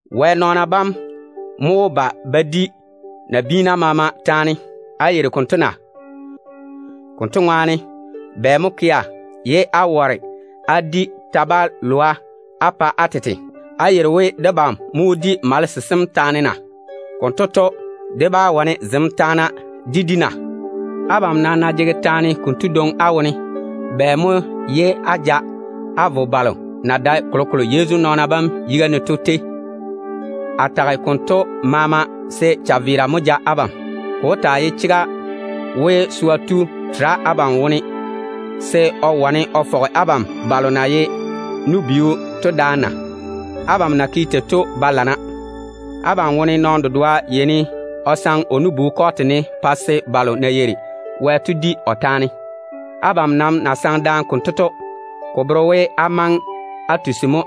Wɛ nɔɔna bam mo wó ba ba di nabiina maama taane. Á yeiri konto na? Konto ŋwaane, bɛ mo kea ye á ware á di ta-balwa á pa á tete? Á yeiri we debam mo wó di malese sem taane na? Konto to, dé bá wane zem taana yam dé di na? Abam nam ná jege taane konto dwoŋi á wone, bɛ mo ye á ja á vo balo na dae kolokolo Yezu nɔɔna bam yiga ne to tei? A tage tento maama se chaveera mo ja abam. Ko wó taa ye chega we, swa tu tere abam wone se o wane o fɔge abam balo na ye nu-biu to daane na? Abam na yeini á ke tei to ba lana. Abam wone nɔɔno dedoa yeini o saŋe o nu-bu kɔɔte ne, pa se balo na yeiri Wɛ to di o taane. Abam nam ná saŋe daane konto, ko bere we á maŋe á ga bora mo.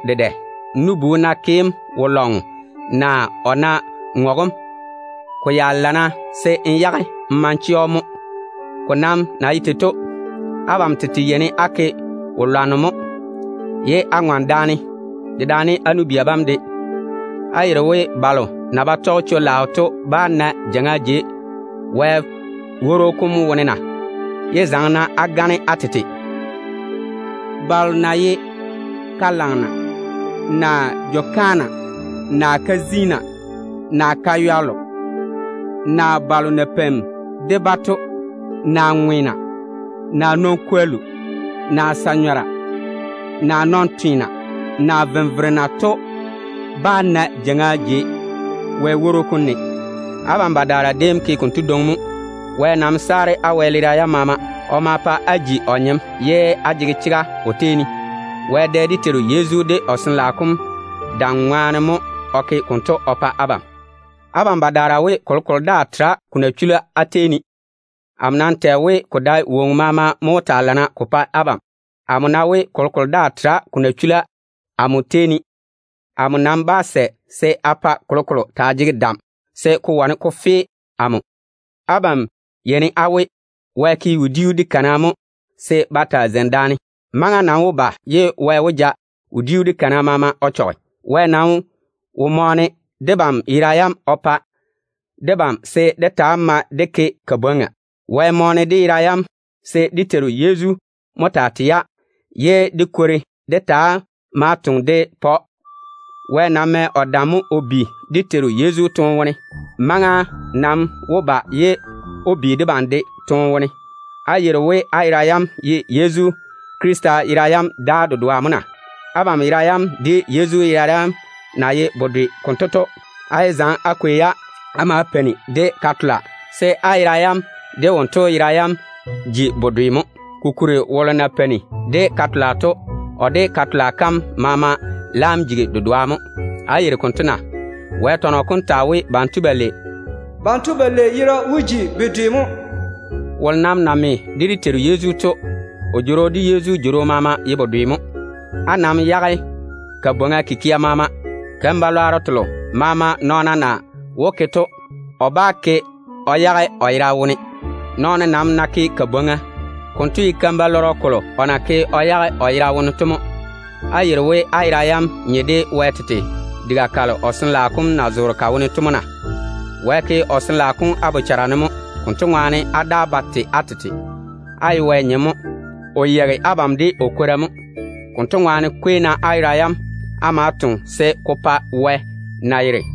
N nu-bu ná ke‑m wo-lɔŋɔ, naa o ná ŋɔge‑m, ko ya lana se n yage n ma n chɛ‑o mo. Ko nam na ye tei to, abam tete yeini á ke wo-lwanno mo, ye á ŋɔne daane, dedaane á nu-bia bam de. Á yeiri we balo na ba tɔge chwo-laao to bá na jeiŋa jei Wɛ paare dem ne na? Yé zaŋe-na á gane á tete. Balo na ye ka-lagena, naa jwo-kaana, naa ka-ziina, naa baywallo, naa balo na peini de-ba to, naa ŋweena, naa nɔn-kwollu, naa sa-nyɔra, naa nɔn-tweena, naa venverena to bá na jeiŋa jei Wɛ woro kom ne. Abam badaara déem ke konto dwoŋi mo. Wɛ nam saare á wɛleera yam maama, se á ta‑á ye wose ye á jege chega o tei ne. Wɛ dɛ dé Teiru Yezu de o Sin-laao kom dam ŋwaane mo o ke konto o pa abam. Abam badaara we, kolokolo daa tera ko na chula á tei ne. Amo nam tɛ we, ko dae woŋo maama mo jege nyɔɔre ko pa abam. Amo ná tage a we, kolokolo daa tera ko na chula amo tei ne, amo nam bá sɛ se a pa kolokolo taa jege dam se ko wane ko fe amo. Abam yeini á we, Wɛ ke wodiu de kana mo se ba taa zeini daane. Maŋa nam wó ba ye Wɛ ja wodiu de kana maama o chɔge. Wɛ nam wo mɔɔne dé yera yam o pa debam se dé taa mae dé ke kabwoŋa. Wɛ mɔɔne dé yera yam se dé Teiru Yezu mo taa tei-ya, ye dé kwori dé taa ma-ya dé toŋe dé pa‑o. Wɛ mɛ o dam mo o bi dé Teiru Yezu toone wone. Maŋa nam wó ba ye o bi debam de toone wone. Á yeiri we á yera yam ye Yezu Krista yera yam daa dedoa mo na? Abam yera yam de Yezu yera yam na ye bedwe konto to, á yé zaŋe á kwei-ya á ma á peini de ka-tola, kokuri á yera yam de wonto yera yam wó ji bedwe mo. Kokuri, wolo ná peini de ka-tola, kotu de ka-tola kam maama laam jigi woŋo dedoa mo. Á yeiri konto na? Wɛ tɔnɔ kom tage we, “Banto balei wó ji yera dedoa mo.” Wolo nam ná me de dé Teiru Yezu, kotu jworo de Yezu jworo maama ye bedwe mo. Nam yage-na kabwoŋa kikia maama. Keim-balwaaro telo maama nɔɔno na wó ke to, o bá ke o yage o yera wone. Nɔɔno nam ná ke kabwoŋa, konto ye keim-balɔrɔ kolo o na ke o yage o yera wone to mo. Á yeiri we á yera yam nye de Wɛ tete diga kam ye o Sin-laao kom mo zoore ka wone na? Wɛ seene o ke o Jworo kom á bochara ne mo. Konto ŋwaane, á daa ba tei á tete. Á ye Wɛ nyem mo. O yeigi abam de o kwora mo. Konto ŋwaane, kwei-na á yera yam á ma á toŋe se ko pa Wɛ na yere.